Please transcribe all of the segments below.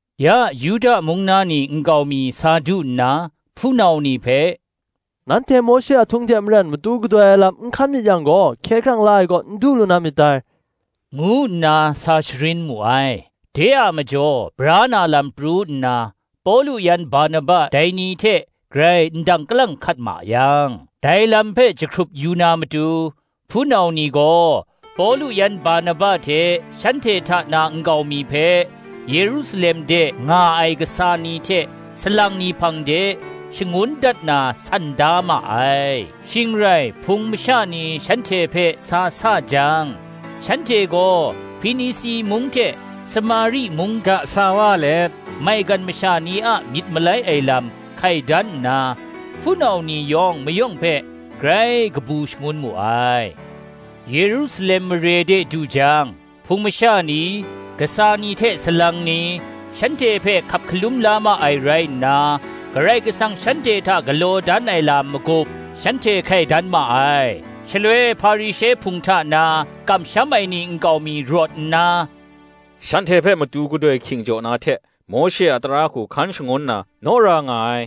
Ya Yuda mung na ni nkau mi sa du nna, hpunau ni hpe, “Nanhte Mawshe a htung hte maren matu gadoi lam n hkan myit yang gaw, hkye hkrang la ai kaw n du lu na myit dai,” ngu nna sa sharin mu ai. De a majaw bra na lam pru nna, Pawlu yan Barnaba dai ni hte grai ndang kalang hkat ma yang, dai lam hpe jahkrup yu na matu, hpunau ni gaw, Pawlu yan Barnaba hte shanhte hta na nkau mi hpe, Yerusalem de nga ai kasa ni hte salang ni hpang de, shangun dat na san da ma ai. shing rai Hpung masha ni shanhte hpe sa sa jang, shanhte gaw Hpinisi mung hte Samari mung ga sa wa let, maigan masha ni a myit malai ai lam hkai dan nna, hpunau ni yawng mayawng hpe grai kabu shangun mu ai. Yerusalem mare de du jang, Hpung masha ni, kasa ni hte salang ni, shanhte hpe hkap hkalum la ma ai rai nna, Karai Kasang shanhte hta galaw dan ai lam magup shanhte hkai dan ma ai. Shaloi Hparishe hpung hta na, kamsham ai ni nkau mi rawt nna, “Shanhte hpe matu gadoi hking jaw na hte, Mawshe a tara hku hkan shangun na naw ra nga ai,”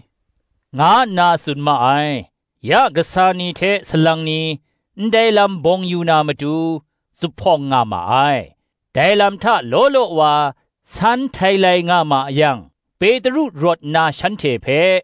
nga nna tsun ma ai. Ya kasa ni hte salang ni, ndai lam bawng yu na matu, zuphpawng nga ma ai. Dai lam hta law law wa san htailai nga ma yang, Petru rawt nna shanhte hpe,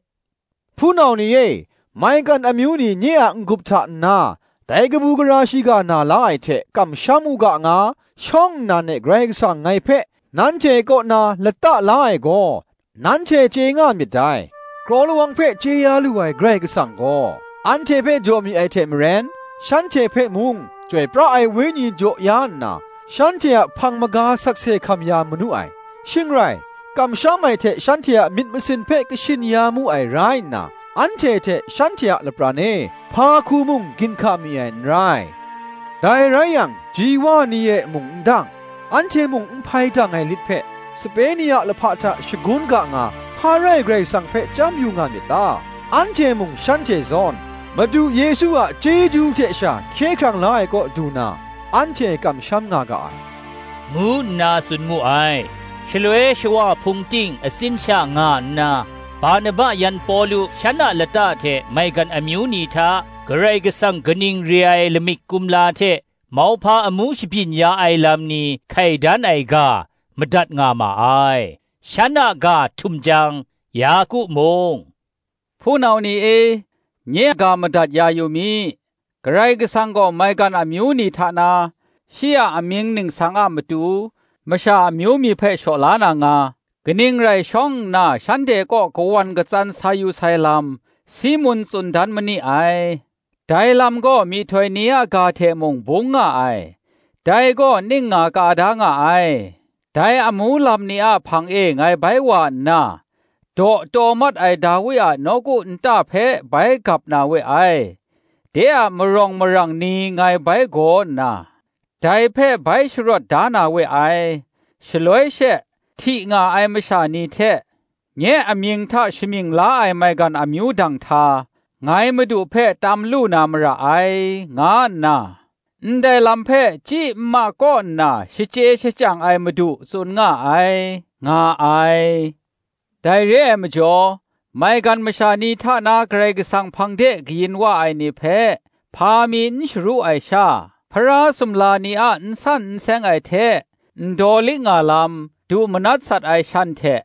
“Hpunau ni e, maigan amyu ni nye a n-gup hta nna, dai kabu gara shiga na la ai hte kamsham u ga nga, shawng nnan e Karai Kasang ngai hpe, nanhte kaw na lata la ai gaw, nanhte chye nga myit dai. Kraw lawang hpe chye ya lu ai Karai Kasang gaw, anhte hpe jaw mi ai hte maren, shanhte hpe mung, Chyoi pra ai Wenyi jaw ya nna, shanhte a hpang maga sakse hkam ya manu ai; shing rai, kamsham ai hte shanhte a myit masin hpe kashin ya mu ai rai nna, anhte hte shanhte a lapran e, hpa hku mung ginhka mi ai n rai. Dai rai yang, ji wa ni e mung n dang, anhte mung n hpai dang ai lit hpe, sape ni a lahpa hta shagun ga nga, hpa rai Karai Kasang hpe chyam yu nga myit ta? Anhte mung shanhte zawn, Madu Yesu a chyeju hte sha hkye hkrang la ai kaw du na, anhte kamsham nga ga ai,” ngu nna tsun mu ai. Shaloi shawa hpung ting atsin sha nga nna, Barnaba yan Pawlu, shan a lata hte maigan amyu ni hta, Karai Kasang kaning re ai lamik kumla hte mauhpa amu shabyin ya ai lam ni hkai dan ai ga, madat nga ma ai. Shan a ga htum jang Yaku mung, “Hpunau ni e, nye ga madat ya yu mi: Karai Kasang gaw maigan amyu ni hta na, shi a amying ningsang a matu, masha amyu mi hpe shaw la na nga, kaning rai shawng nna shanhte kaw kawan katsan sa yu sai lam, Simun tsun dan ma ni ai. Dai lam gaw myihtoi ni a ga hte mung bung nga ai: dai gaw ning nga ka da nga ai, ‘Dai amu lam ni a hpang e ngai bai wa nna, Daw taw mat ai Dawi a nawku nta hpe bai gap na we ai; De a marawng marang ni ngai bai gaw nna, Dai hpe bai sharawt da na we ai: Shaloi she, hti nga ai masha ni hte, Nye amying hta shamying la ai maigan amyu danghta, ngai Madu hpe tam lu na mara ai,’ nga nna, Ndai lam hpe chyi nma kaw nna shachye shachyang ai Madu tsun nga ai,” nga ai. “Dai re ai majaw, maigan masha ni hta na Karai Kasang hpang de kayin wa ai ni hpe, hpa mi n sharu ai sha, Hpara sumla ni a n san n seng ai hte, ndaw liknga lam, du manat sat ai shan hte,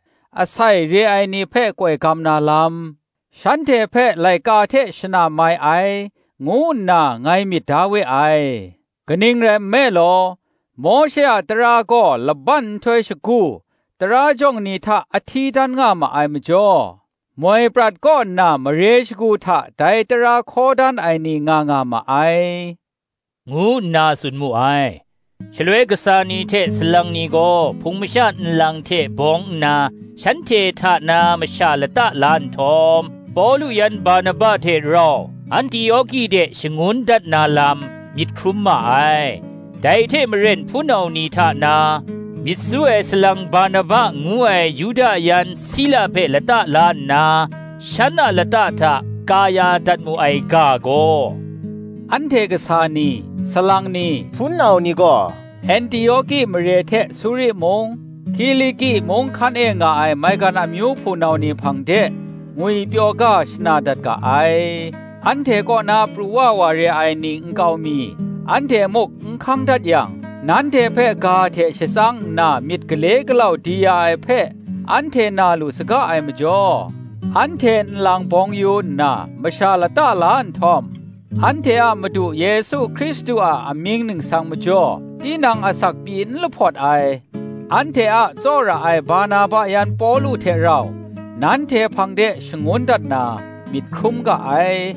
asai re ai ni hpe koi gam na lam, shanhte hpe laika hte shana mai ai, ngu nna ngai myit da we ai. Kaning rai nme law, Mawshe a tara gaw laban nhtoi shagu, tara jawng ni hta a hti dan nga ma ai majaw, moi prat kaw nna mare shagu, hta dai tara hkaw dan ai ni nga nga ma ai,” ngu nna tsun mu ai. Shaloi kasa ni hte salang ni gaw hpung masha nlang hte bawng nna, shanhte hta na masha lata la nhtawm, Pawlu yan Barnaba hte rau Antioki de shangun dat na lam myit hkrum ma ai: dai hte maren hpunau ni hta na, myit su ai salang Barsaba ngu ai Yuda yan Sila hpe lata la nna, shan a lata hta ka ya dat mu ai ga gaw, “Anhte kasa ni, salang ni, hpunau ni gaw, Antioki mare hte Suri mung, Kiliki mung hkan e nga ai maigan amyu hpunau ni hpang de ngwipyaw ga shana dat ga ai. Anhte kaw na pru wa wa re ai nkau mi, anhte muk n hkang dat yang, nanhte hpe ga hte shatsang nna myit gale galau di ya ai hpe, anhte na lu saga ai majaw, anhte nlang bawng yu nna, masha lata la nhtawm, anhte a Madu Yesu Hkristu a mying ningsang majaw tinang asak pyi n lahpawt ai, anhte a tsawra ai Barnaba yan Pawlu hte rau, nanhte hpang de shangun dat na, myit hkrum ga ai.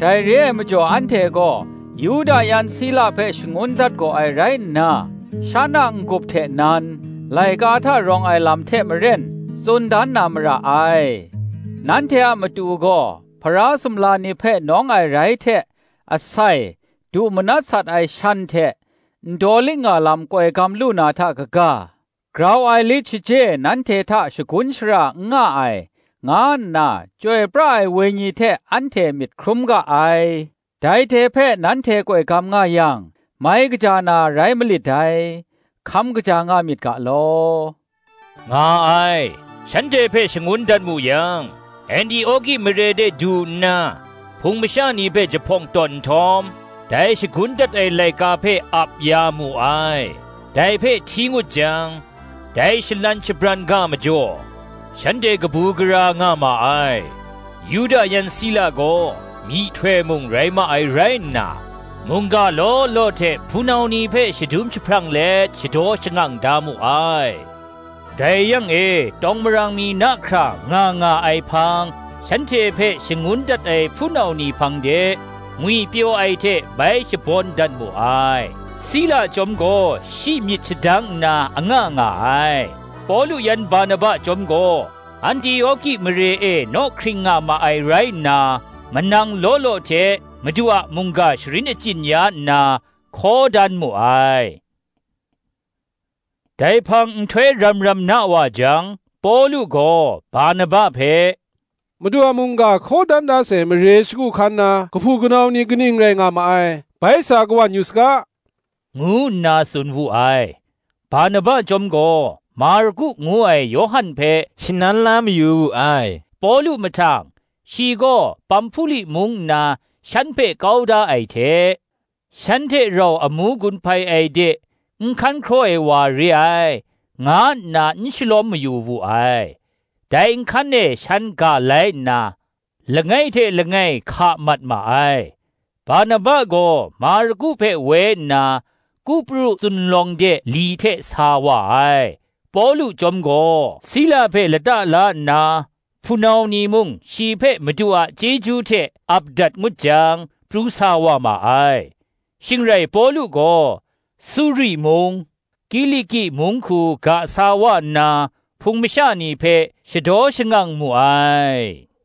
Dai re ai majaw anhte gaw Yuda yan Sila hpe shangun dat gaw ai rai nna, shan a n-gup hte nan, laika hta rawng ai lam hte maren, tsun dan na mara ai. Nanhte a matu gaw, Hpara sumla ni hpe nawng ai rai hte, asai, du manat sat ai shan hte, ndaw liknga lam koi gam lu na hta kaga, grau ai lit shaje nanhte hta shagun shara n nga ai, nga nna, Chyoi pra ai Wenyi hte anhte myit hkrum ga ai; dai hte hpe nanhte koi gam nga yang, mai kaja na rai malit dai. Hkam kaja nga myit ga law,” nga ai. Shanhte hpe shangun dat mu yang, Antioki mare de du nna, hpung masha ni hpe jahpawng tawn nhtawm, dai shagun dat ai laika hpe ap ya mu ai. Dai hpe hti ngut jang, dai shalan shabran ga majaw, shanhte kabu gara nga ma ai. Yuda yan Sila gaw, myihtoi mung rai ma ai rai nna, mungga law law hte hpunau ni hpe shadum jahprang let shadaw shangang da mu ai. Dai yang e tawng marang mi na hkra nga nga ai hpang, shanhte hpe shangun dat ai hpunau ni hpang de, ngwipyaw ai hte bai shabawn dat mu ai. Sila chyawm gaw shi myit shadang nna anga nga ai. Pawlu yan Barnaba chyawm gaw, Antioki mare e naw hkring nga ma ai rai nna, manang law law hte, Madu a mungga sharin achyin ya nna, hkaw dan mu ai. Dai hpang, nhtoi ram ram na wa jang, Pawlu gaw Barnaba hpe, “Madu a mungga hkaw dan da sai mare shagu hkan na kahpu kanau ni kaning rai nga ma ai, bai sa kawan yu saga,” ngu nna tsun wu ai. Barnaba chyawm gaw Marku ngu ai Yawhan hpe shanan la mayu wu ai. Pawlu mahtang, shi gaw Pamhpuli mung nna shan hpe kau da ai hte, shan hte rau amu gun hpai ai de n hkan hkraw ai wa re ai, nga nna n shalawm mayu wu ai. Dai nhkan e shan ga lai nna, langai hte langai hka mat ma ai; Barnaba gaw Marku hpe woi nna, Kupru zunlawng de li hte sa wa ai. Pawlu chyawm gaw Sila hpe lata la nna, hpunau ni mung shi hpe Madu a chyeju hte ap dat ngut jang, pru sa wa ma ai. Shing rai Pawlu gaw, Suri mung, Kiliki mung hku ga sa wa nna, Hpung masha ni hpe shadaw shangang mu ai.